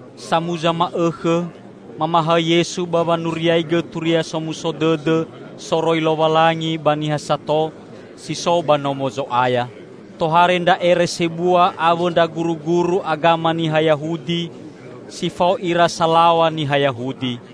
Samuza ma'õkhõ, mamahaõ Yesu ba wanuriaigõ Turia Somuso Dõdõ soroi Lowalangi ba niha sato si so ba Nomo Zo'aya. Tohare ndra ere sebua awõ ndra guruguru agama niha Yahudi, si fao ira salaw̃a niha Yahudi.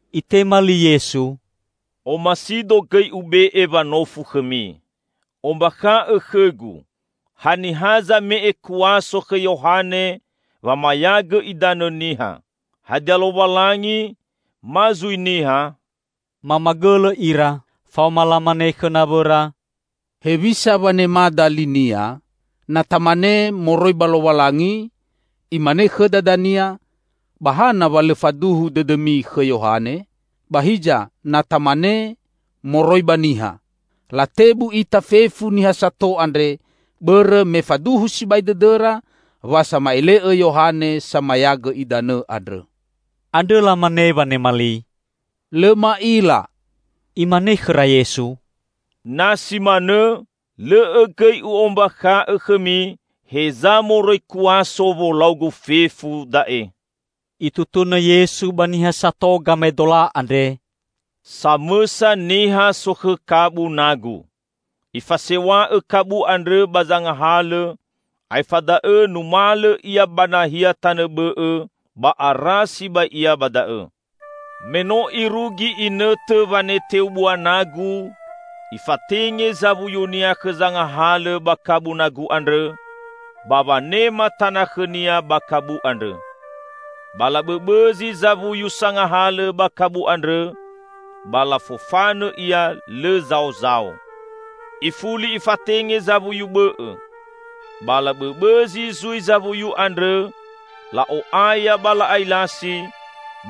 Itema li Yesu, "Omasido gõi Ube'e wanofu khõmi. Ombakha'õ khõ-Gu, haniha zame'e kuaso khõ Yohane wamayagõ idanõ niha. Hadia Lowalangi ma zui niha?" Mamagõlõ ira. Faoma lamane khõ nawõra, "Hewisa wanemada li-Nia? Na tamane, 'Moroi ba Lowalangi,' Imane khõda dania, 'Ba hana wa lõ faduhu dõdõmi khõ Yohane?' Ba hiza, na tamane, 'Moroi ba niha.' Latebu ita fefu niha sato andre, bõrõ me faduhu sibai dõdõra wa sama'ele'õ Yohane Samayagõ Idanõ andrõ." Andrõ lamane wanema li, "Lõ ma'ila." Imane khõra Yesu, "Na si manõ lõ'õ gõi U'ombakha'õ khõmi heza moroi kuaso wolau-Gu fefu da'e." Itutunõ Yesu ba niha sato gamaedola andre, "Samõsa niha sokhõ kabu nagu. Ifasew̃a'õ kabu andrõ ba zangahalõ, aefa da'õ numalõ ia ba nahia tanõ bõ'õ ba ara sibai ia ba da'õ. Me no irugi inõtõ waneteu bua nagu, ifatenge zawuyunia khõ zangahalõ ba kabu nagu andrõ, ba wanema tana khõnia ba kabu andrõ. Ba labõbõzi zawuyu sangahalõ ba kabu andrõ ba lafofanõ ia lõ zaozao. Ifuli ifatenge zawuyu bõ'õ; ba labõbõzi zui zawuyu andrõ, la'o'aya ba la'ailasi,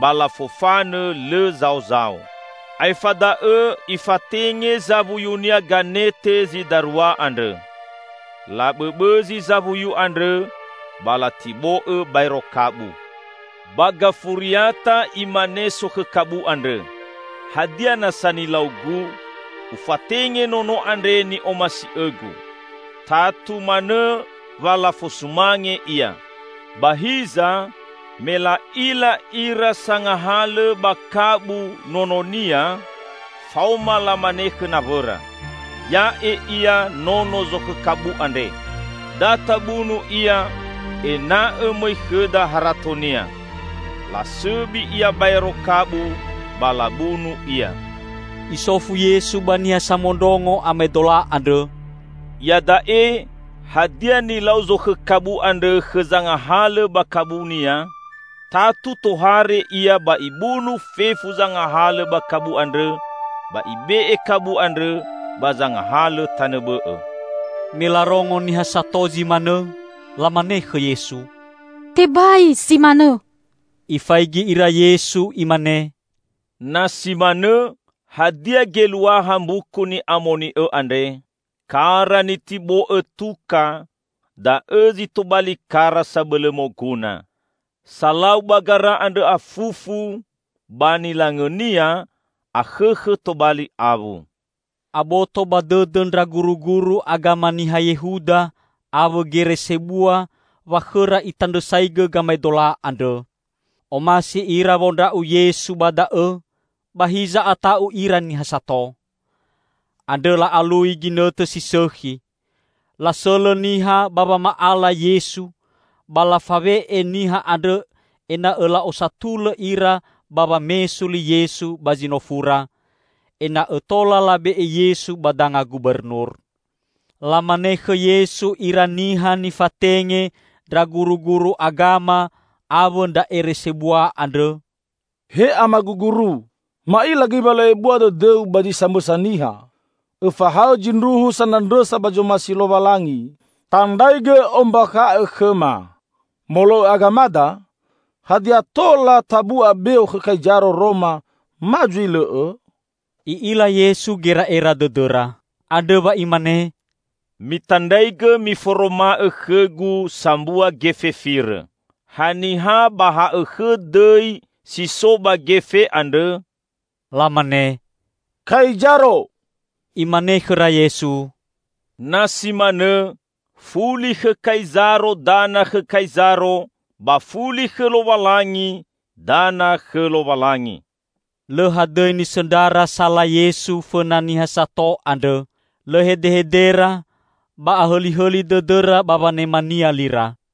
ba lafofanõ lõ zaozao. Aefa da'õ ifatenge zawuyunia ganete zi darua andrõ. Labõbõzi zawuyu andrõ ba latibo'õ baero kabu. Ba gafuriata imane sokhõ kabu andrõ, 'Hadia nasa nilaugu? Ufatenge nono andre ni'omasi'õgu. Tatu manõ wa lafosumange ia!' Ba hiza me la'ila ira sangahalõ ba kabu nononia, faoma lamane khõ nawõra, 'Ya'e ia nono zokhõ kabu andre. Da tabunu ia, ena'õ mõi khõda haratonia.' Lasõbi ia baero kabu ba labunu ia." Isofu Yesu ba niha samondrongo amaedola andrõ, "Iada'e, hadia nilau zokhõ kabu andrõ khõ zangahalõ ba kabunia? Tatu tohare ia ba ibunu fefu zangahalõ ba kabu andrõ, ba ibe'e kabu andrõ ba zangahalõ tanõ bõ'õ." Me larongo niha sato zi manõ, lamane khõ Yesu, "Tebai zi manõ!" Ifaigi ira Yesu imane, "Na si manõ, hadia geluaha Mbuku Ni'amoni'õ andre? 'Kara nitibo'õ tuka, da'õ zi tobali kara sabõlõ moguna.' Salau ba gara andrõ afufu; ba nilangõnia, akhõkhõ tobali awu." Aboto ba dõdõ ndra guruguru agama niha Yehuda awõ gere sebua wa khõra Itandrõsaigõ gamaedola andrõ. Omasi ira wondra'u Yesu ba da'õ, ba hiza ata'u ira niha sato. Andrõ la'alui ginõtõ si sõkhi. Lasõlõ niha ba wama'ala Yesu, ba lafawe'e niha andrõ ena'õ la'osatulõ ira ba wamesu li Yesu ba zinofura, ena'õ tola labe'e Yesu ba danga gubernur. Lamane khõ Yesu ira niha nifatenge ndra guruguru agama awõ ndra ere sebua andrõ, "He Amagu Guru, ma'ila gõi wa lõ ebua dõdõ-U ba zi samõsa niha; õfahaõ zindruhu sanandrõsa ba zomasi Lowalangi. Tandraigõ ombakha'õ khõma, molo'õ agamada, hadia tola tabu'a beo khõ Kaizaro Roma ma zui lõ'õ?" I'ila Yesu gera'era dõdõra. Andrõ wa Imane, "Mitandraigõ miforoma'õ khõ-Gu sambua gefe firõ. Haniha ba ha'õkhõ dõi si so ba gefe andrõ?" Lamane, "Kaizaro!" Imane khõra Yesu, "Na si manõ, fuli khõ Kaizaro dana khõ Kaizaro ba fuli khõ Lowalangi dana khõ Lowalangi." Lõ hadõi nisõndrara sala Yesu fõna niha sato andrõ. Lõ hedehedera ba ahõlihõli dõdõra ba wanema-Nia lira.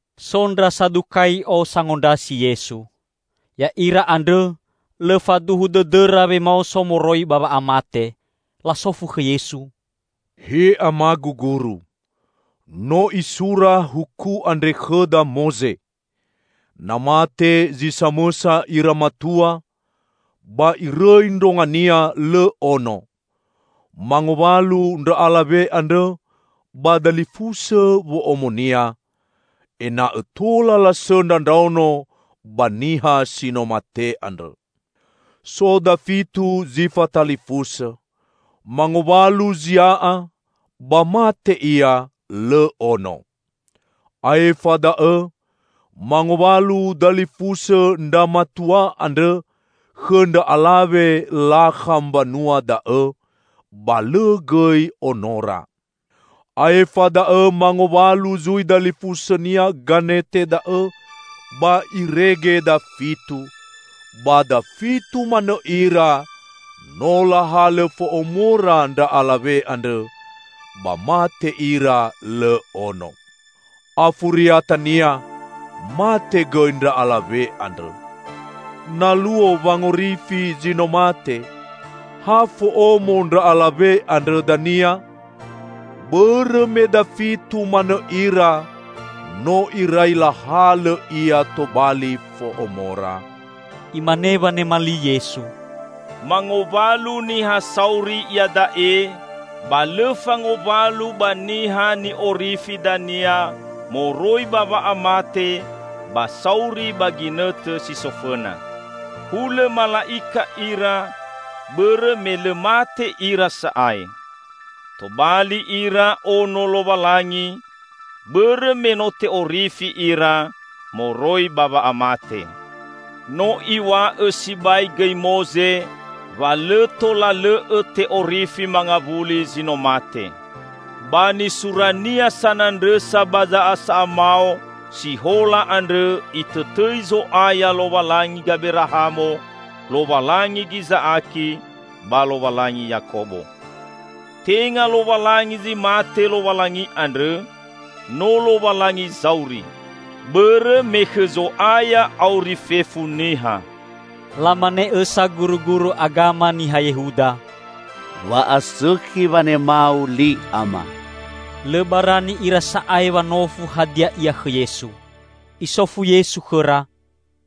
So ndra Sadukai'o sangondrasi Yesu. (Ya'ira andrõ, lõ faduhu dõdõra wemaoso moroi ba wa'amate.) Lasofu khõ Yesu, "He Amagu Guru, no isura huku andre khõda Moze. Na mate zi samõsa ira matua, ba irõi ndrongania lõ ono, mangowalu ndra alawe andrõ ba dalifusõ wo'omonia, ena'õ tola lasõndra ndraono ba niha si no mate andrõ. So dafitu zi fatalifusõ. Mangowalu zia'a, ba mate ia lõ ono. Aefa da'õ mangowalu dalifusõ ndra matua andrõ khõ ndra alawe lakha mbanua da'õ, ba lõ gõi onora. Aefa da'õ mangowalu zui dalifusõnia ganete da'õ, ba irege dafitu: ba dafitu manõ ira no lahalõ fo'omora ndra alawe andrõ, ba mate ira lõ ono. Afuriatania mate gõi ndra alawe andrõ. Na luo wangorifi zi no mate, ha fo'omo ndra alawe andrõ dania? Bõrõ me dafitu manõ ira no irai lahalõ ia tobali fo'omora." Imane wanema li Yesu, "Mangowalu niha sauri iada'e, ba lõ fangowalu ba niha ni'orifi dania moroi ba wa'amate ba sauri ba ginõtõ si so fõna. Hulõ mala'ika ira, bõrõ me lõ mate ira sa'ae. Tobali ira ono Lowalangi, bõrõ me no te'orifi ira moroi ba wa'amate. No iw̃a'õ sibai gõi Moze wa lõ tola lõ'õ te'orifi mangawuli zi no mate. Ba nisurania sanandrõsa ba za'asa'a mao si hola andrõ itõtõi Zo'aya 'Lowalangi Gaberahamo, Lowalangi Giza'aki ba Lowalangi Yakobo.' Tenga Lowalangi zi mate Lowalangi andrõ, no Lowalangi zauri! Bõrõ me khõ Zo'aya auri fefu niha." Lamane õsa guruguru agama niha Yehuda, "Wa'asõkhi wanema-U li Ama." Lõ barani ira sa'ae wanofu hadia ia khõ Yesu. Isofu Yesu khõra,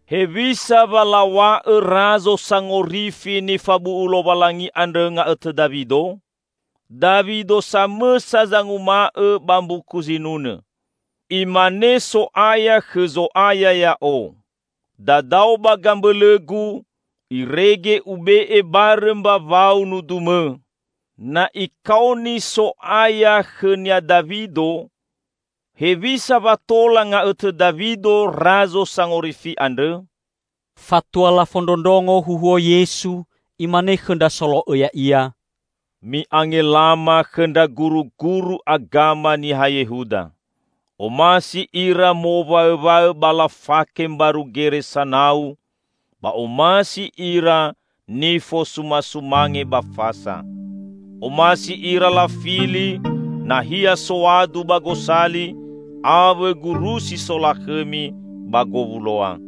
"Hewisa wa law̃a'õ Razo Sangorifi nifabu'u Lowalangi andrõ nga'õtõ Dawido? Dawido samõsa zanguma'õ ba mbuku Zinunõ, 'Imane So'aya khõ Zo'aya ya'o: Dadao ba gambõlõ-Gu, Irege Ube'e barõ mbawau-U nudu-Mõ!' Na ikaoni 'So'aya', khõnia Dawido, hewisa wa tola nga'õtõ Dawido Razo Sangorifi andrõ?" Fatua lafondrondrongo huhuo Yesu, Imane khõ ndra solo'õ Ya'ia, "Mi'angelama khõ ndra guruguru agama niha Yehuda. Omasi ira mowaõwaõ ba lafake mbaru gere sanau, ba omasi ira nifosumasumange ba fasa. Omasi ira lafili nahia soadu ba gosali awõ gurusi solakhõmi ba gowuloa.